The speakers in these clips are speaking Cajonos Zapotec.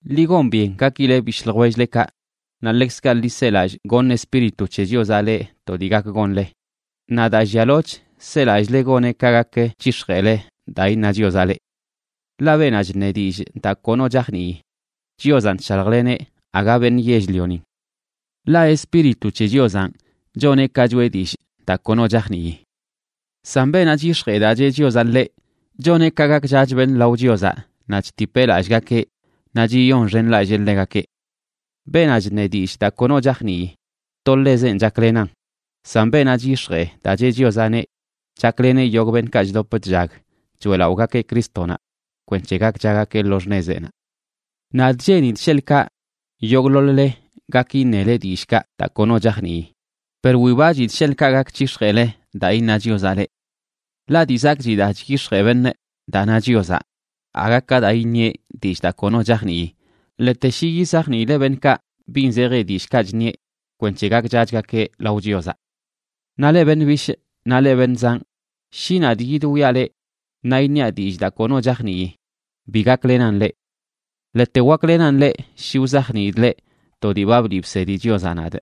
Ḻi gon byen gakileꞌ bishꞌ ljwell-lekaꞌ naꞌ ḻekzkaꞌ ḻi selallꞌ goṉ Espíritu c̱he Chiozaꞌ leꞌ to dii gak gonle, naꞌ daa llialoch selallꞌle goneꞌ ka gak c̱hix̱jeꞌle daa iṉa Chiozaꞌ leꞌ. Ḻaꞌ beenaꞌ chṉe dillꞌ daa kono chajnii, Chiozanꞌ chshaljleneꞌ, aga beṉꞌ yell-lionin. Ḻaꞌ Espíritu c̱he Chiozanꞌ choneꞌ ka choꞌe dillꞌ daa kono chajnii. San beenaꞌ chyix̱jee daa cheꞌ Chiozaꞌ ḻeꞌ, choneꞌ ka gakchach beṉꞌ lao Chiozaꞌ, naꞌ chtipeꞌ lallꞌgakeꞌ naꞌ chiyonxenlallee ḻegakeꞌ. Beenaꞌ chṉe dillꞌ daa kono chajnii, to ḻeꞌzenꞌ chaklenan, san beenaꞌ chyix̱jee daa cheꞌ Chiozaꞌneꞌ chakleneꞌ yogꞌ beṉꞌkaꞌ chdop chllag choeꞌlaꞌogakeꞌ Crístonaꞌ kwenc̱he gakchagakeꞌ lo xṉezeꞌnaꞌ. Nadꞌ cheenidꞌ sheḻꞌkaꞌ yogꞌḻoḻ-le gak iṉele dillꞌkaꞌ daa kono chajnii, per wibachidꞌ sheḻꞌkaꞌ gak c̱hix̱jeꞌle daa iṉa Chiozaꞌ leꞌ. Ḻaꞌ dii zakꞌchi daa chyix̱jee beṉꞌ daa na Chiozaꞌ aga ka daa iṉieꞌ dillꞌ daa kono chajnii, ḻete shi yizajniileꞌ beṉꞌkaꞌ bin zeji dillꞌkaꞌ chṉieꞌ kwenc̱he gakchachgakeꞌ lao Chiozaꞌ. Naꞌ leꞌ beṉꞌ bishꞌ naꞌ leꞌ beṉꞌ zanꞌ, shi nadꞌ yidwiaꞌ leꞌ naꞌ iṉiaꞌ dillꞌ daa kono chajnii, bi gaklenan leꞌ. Ḻete waklenan leꞌ shi wzajniidꞌ leꞌ to dii ba bliꞌ bsedi Chiozaꞌ nadꞌ,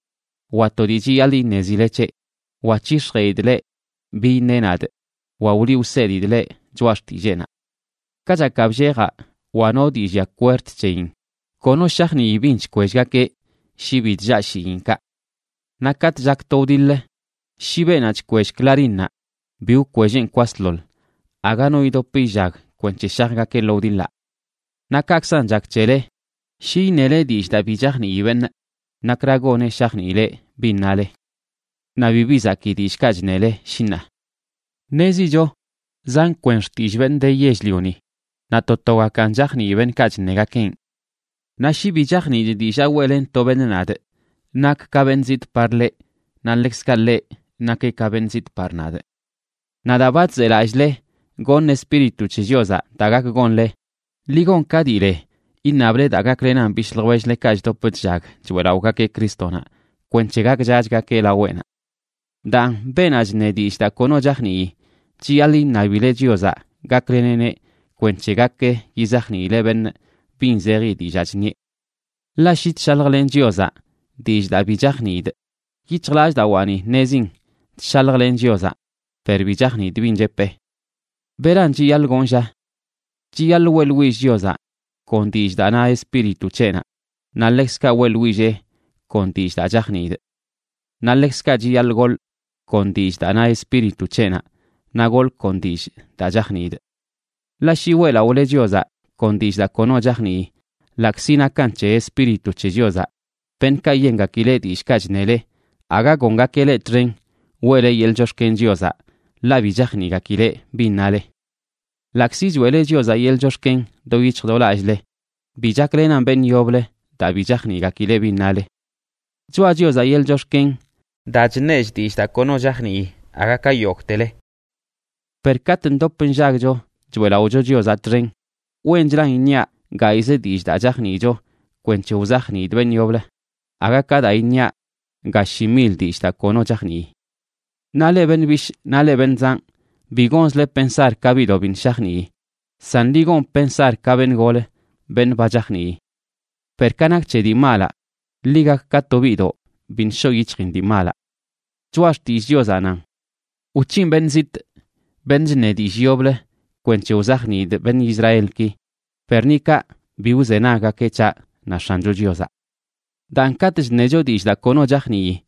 wa to dii chiyaḻꞌ iṉezile c̱heꞌ, wa c̱hix̱jeꞌidꞌ leꞌ bi iṉeꞌ nadꞌ, wa wliꞌ wsedidꞌ leꞌ choꞌa xtilleenaꞌ. Kachakaꞌ bllejaꞌ wa no dii llia kwerd c̱heyin, kono shajnii bin chkwellgakeꞌ shi bi chllaa shiinkaꞌ. Naꞌ katꞌ chak to wdiḻ, shi beenaꞌ chkwell clarínnaꞌ bi wkwelleꞌn kwasḻoḻ, aga no idop illag kwenc̱he shajgakeꞌ lo wdiḻaꞌ. Naꞌ kaꞌkzan chak c̱hele, shi iṉele dillꞌ daa bi chajnii beṉꞌ, nakra goneꞌ shajniileꞌ bin nale. Naꞌ bibi zakii dillꞌkaꞌ chṉele shi ṉaa. Ṉezicho zan kwen xtillꞌ beṉꞌ de yell-lioni naꞌ to togakan chajnii beṉꞌkaꞌ chṉegakeꞌn. Naꞌ shi bi chajniidꞌ dillaa weꞌlen to beṉꞌ nadꞌ, nakꞌ ka beṉꞌ zitꞌ par ḻeꞌ, naꞌ ḻekzkaꞌ ḻeꞌ nakeꞌ ka beṉꞌ zitꞌ par nadꞌ. Naꞌ daa ba chzelallꞌle goṉ Espíritu c̱he Chiozaꞌ daa gak gonle, ḻi gon ka dii le iṉable daa gaklenan bishꞌ ljwell-lekaꞌ chdop chllag choeꞌlaꞌogakeꞌ Crístonaꞌ kwenc̱he gakchachgakeꞌ laweꞌnaꞌ. Daan, beenaꞌ chṉe dillꞌ daa kono chajnii, chiyaḻꞌ iṉabileꞌ Chiozaꞌ gakleneꞌneꞌ kwenc̱he gak yizajniileꞌ beṉꞌ bin zeji dillaa chṉieꞌ. Ḻaꞌ shi chshaljlenꞌ Chiozaꞌ dillꞌ daa bi chajniidꞌ, yic̱hjlallꞌdawaani ṉezin chshaljlenꞌ Chiozaꞌ, per bi chajniidꞌ bin chepee. ¿Beran chiyaḻꞌ gonꞌ, lla? Chiyaḻꞌ weꞌḻwillꞌ Chiozaꞌ kon dillꞌ daa na Espíritu c̱heꞌnaꞌ, naꞌ ḻekzkaꞌ weꞌḻwillee kon dillꞌ daa chajniidꞌ. Naꞌ ḻekzkaꞌ chiyaḻꞌ goḻꞌ kon dillꞌ daa na Espíritu c̱heꞌnaꞌ, naꞌ goḻꞌ kon dillꞌ daa chajniidꞌ. Ḻaꞌ shi weꞌlaꞌole Chiozaꞌ kon dillꞌ daa kono chajnii, ḻaꞌkzi nakan c̱he Espíritu c̱he Chiozaꞌ, beṉꞌkaꞌ yengakileꞌ dillꞌkaꞌ chṉele aga gongakeꞌ leꞌ txen weꞌle yeḻꞌ chox̱ken Chiozaꞌ ḻaꞌ bi chajniꞌgakileꞌ bin nale. Ḻaꞌkzi choeꞌle Chiozaꞌ yeḻꞌ chox̱ken do yic̱hj do lallꞌle, bi chaklenan beṉꞌ yoblə daa bi chajniꞌgakileꞌ bin nale. Choꞌa Chiozaꞌ yeḻꞌ chox̱ken daa chṉechꞌ dillꞌ daa kono chajnii aga ka yogꞌtele. Per katꞌ ndop nllagcho choeꞌlaꞌocho Chiozaꞌ txen, wenchlan iṉiaꞌ gayꞌzə dillꞌ daa chajniicho kwenc̱he wzajniidꞌ beṉꞌ yoblə, aga ka daa iṉiaꞌ ga shi mil dillꞌ daa kono chajnii. Naꞌ leꞌ beṉꞌ bishꞌ naꞌ leꞌ beṉꞌ zanꞌ, bi gonzle pensar ka biꞌdoꞌ biṉꞌ shajnii, san ḻi gon pensar ka beṉꞌ golə, beṉꞌ ba chajnii. Per ka nak c̱he dii malaꞌ, ḻi gak ka to biꞌdoꞌ biṉꞌ shoꞌ yic̱hjin dii malaꞌ. Choꞌa Xtillꞌ Chiozaꞌ nan: “Wc̱hinꞌ beṉꞌ zitꞌ, beṉꞌ chṉe dillꞌ yoblə, kwenc̱he wzajniidꞌ beṉꞌ Israelki, per ni kaꞌ bi wzenaggakeꞌ c̱haꞌ, na X̱ancho Chiozaꞌ.” Daan, katꞌ chṉecho dillꞌ daa kono chajnii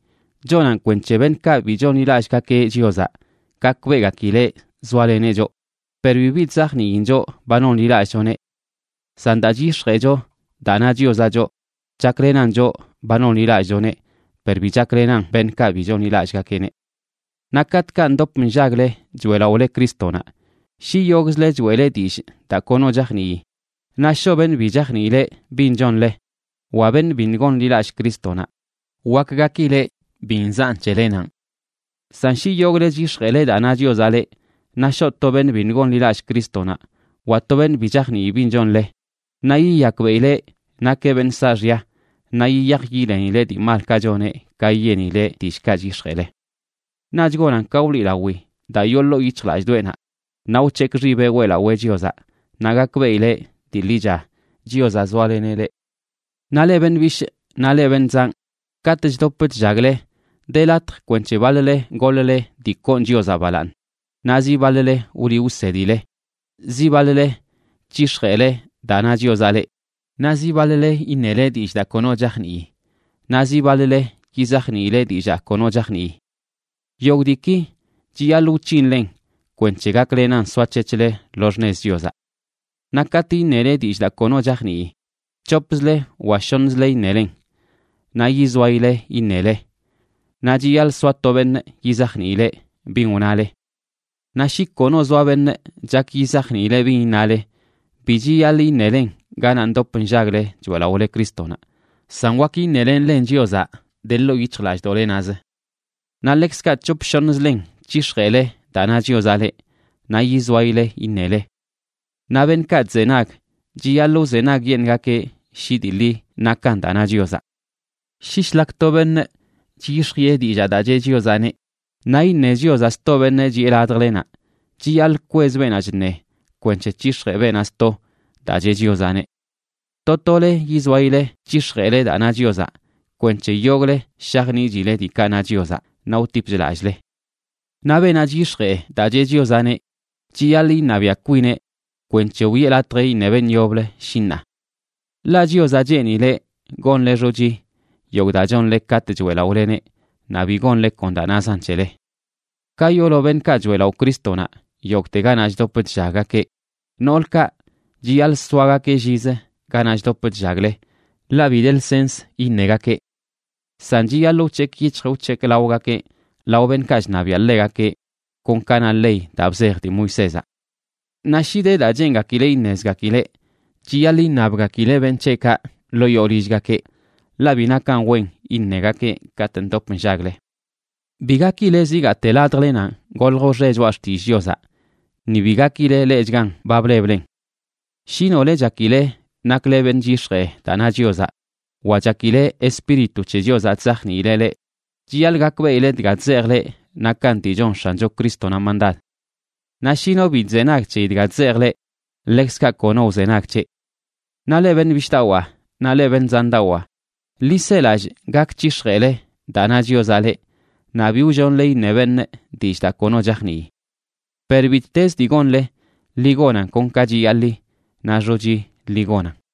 chonan kwenc̱he beṉꞌkaꞌ bi chonḻilallꞌgakeꞌ Chiozaꞌ gakbeꞌgakileꞌ zoaleneꞌ choꞌ per bibi chzajniin choꞌ ba nonḻilallꞌchoneꞌ. San daa c̱hix̱jeꞌcho daa na Chiozaꞌ choꞌ, chaklenan choꞌ ba nonḻilallꞌchoneꞌ per bi chaklenan beṉꞌkaꞌ bi chonḻilallꞌgakeꞌneꞌ. Naꞌ katꞌkaꞌ ndop nllagle choeꞌlaꞌole Crístonaꞌ, shi yogꞌzle choeꞌle dillꞌ daa kono chajnii, naꞌ shoꞌ beṉꞌ bi chajniileꞌ bin chonle wa beṉꞌ biṉꞌ gonḻilallꞌ Crístonaꞌ, wak gakileꞌ bi nzaꞌn c̱helenanꞌ. San shi yogꞌle chyix̱jeꞌle daa na Chiozaꞌ leꞌ, naꞌ shoꞌ to beṉꞌ biṉꞌ gonḻilallꞌ Crístonaꞌ wa to beṉꞌ bi chajnii bin chonle, naꞌ yiyakbeꞌileꞌ nakeꞌ beṉꞌ saaxya naꞌ yiyaj yilenileꞌ dii malkaꞌ choneꞌ ka yenileꞌ dillꞌkaꞌ chyix̱jeꞌle. Naꞌch gonan ka wliꞌlawi daa yoo ḻoo yic̱hjlallꞌdoꞌenaꞌ, naꞌ wc̱hekꞌ xibeꞌ weꞌlawee Chiozaꞌ, naꞌ gakbeꞌileꞌ dii ḻicha Chiozaꞌ zoaleneꞌ leꞌ. Naꞌ leꞌ beṉꞌ bishꞌ naꞌ leꞌ beṉꞌ zanꞌ, katꞌ chdop chllagle de latj kwenc̱he baḻ-le goḻ-le dii koon Chiozaꞌ balaaṉ, naꞌ zi baḻ-le wliꞌ wsedile, zi baḻ-le c̱hix̱jeꞌle daa na Chiozaꞌ leꞌ, naꞌ ziꞌ baḻ-le iṉele dillꞌ daa kono chajnii, naꞌ zi baḻ-le yizajniile dillaa kono chajnii. Yogꞌ diiki chiyaḻꞌ wc̱hinlen kwenc̱he gaklenan soac̱hec̱hle lo xṉez Chiozaꞌ. Naꞌ katꞌ iṉele dillꞌ daa kono chajnii, c̱hopzle wa shoṉzle iṉelen, naꞌ yizoayile iṉele, naꞌ chiyaḻꞌ soa to beṉꞌ yizajniileꞌ bin wnale. Naꞌ shi kono zoa beṉꞌ chak yizajniileꞌ bin iṉale, bi chiyaḻꞌ iṉelen ganaꞌ ndop nllagle choeꞌlaꞌole Crístonaꞌ, san wak iṉelenlen Chiozaꞌ de ḻoo yic̱hjlallꞌdoꞌlenaꞌzə. Naꞌ ḻekzkaꞌ c̱hop shoṉzlen c̱hix̱jeꞌle daa na Chiozaꞌ leꞌ, naꞌ yizoayile iṉele. Naꞌ beṉꞌkaꞌ chzenag, chiyaḻꞌ wzenagyeṉꞌgakeꞌ shi dii ḻi nakan daa na Chiozaꞌ. Shi shlak to beṉꞌ chyix̱jiꞌe dillaa daa cheꞌ Chiozaꞌneꞌ, naꞌ iṉe Chiozaꞌ sto beṉꞌ chiꞌe ladjlenaꞌ, chiyaḻꞌ kwez beenaꞌ chṉe kwenc̱he c̱hix̱jee beenaꞌ sto daa cheꞌ Chiozaꞌneꞌ. To tole yizoayile c̱hix̱jeꞌle daa na Chiozaꞌ kwenc̱he yogꞌle shajniꞌchile diikaꞌ na Chiozaꞌ naꞌ wtipch lallꞌle. Naꞌ beenaꞌ chyix̱jee daa cheꞌ Chiozaꞌneꞌ chiyaḻꞌ iṉabiaꞌ kwineꞌ kwenc̱he wiꞌe latj iṉe beṉꞌ yoblə, shi ṉaa. Ḻaꞌ Chiozaꞌ cheenileꞌ gonle xochi yogꞌ daa chonle katꞌ choeꞌlaꞌoleneꞌ naꞌ bi gonle kon daa nazan c̱hele. Ka yoolo beṉꞌkaꞌ choeꞌlaꞌo Crístonaꞌ yogꞌte ganaꞌ chdop chllaggakeꞌ, noolkaꞌ chiyaḻꞌ soagakeꞌ llizə ganaꞌ chdop chllagle, ḻaꞌ bi de lsens iṉegakeꞌ. San chiyaḻꞌ wc̱hekꞌ yic̱hj wc̱hekꞌ laogakeꞌ lao beṉꞌkaꞌ chṉabiaꞌ ḻegakeꞌ, kon ka na ley daa bzej dii Moisézaꞌ. Naꞌ shi de daa cheengakileꞌ iṉezgakileꞌ, chiyaḻꞌ iṉabgakileꞌ beṉꞌ c̱heꞌkaꞌ ḻoo yoo lillgakeꞌ, ḻaꞌ bi nakan wen iṉegakeꞌ katꞌ ndop nllagle. Bi gakile zigaate ladjlenanꞌ golj wxe choꞌa xtillꞌ Chiozaꞌ, ni bi gakile leꞌchgan ba bleblen. Shi nole chakile nakle beṉꞌ chyix̱jee daa na Chiozaꞌ, wa chakile Espíritu c̱he Chiozaꞌ chzajniileꞌ leꞌ, chiyaḻꞌ gakbeꞌile dga chzejꞌ leꞌ nakan dii chon X̱ancho Crístonaꞌ mandad. Naꞌ shi no bi chzenag c̱heyi dga chzejꞌ leꞌ, ḻekzkaꞌ kono wzenag c̱heꞌ. Naꞌ leꞌ beṉꞌ bishꞌdawaa naꞌ leꞌ beṉꞌ zandawaa, ḻi selallꞌ gak c̱hix̱jeele daa na Chiozaꞌ leꞌ, naꞌ bi wllonle iṉe beṉꞌ dillꞌ daa kono chajnii. Per bittezə dii gonle, ḻi gonan kon ka chiyaḻi naꞌ xochi ḻi gonan.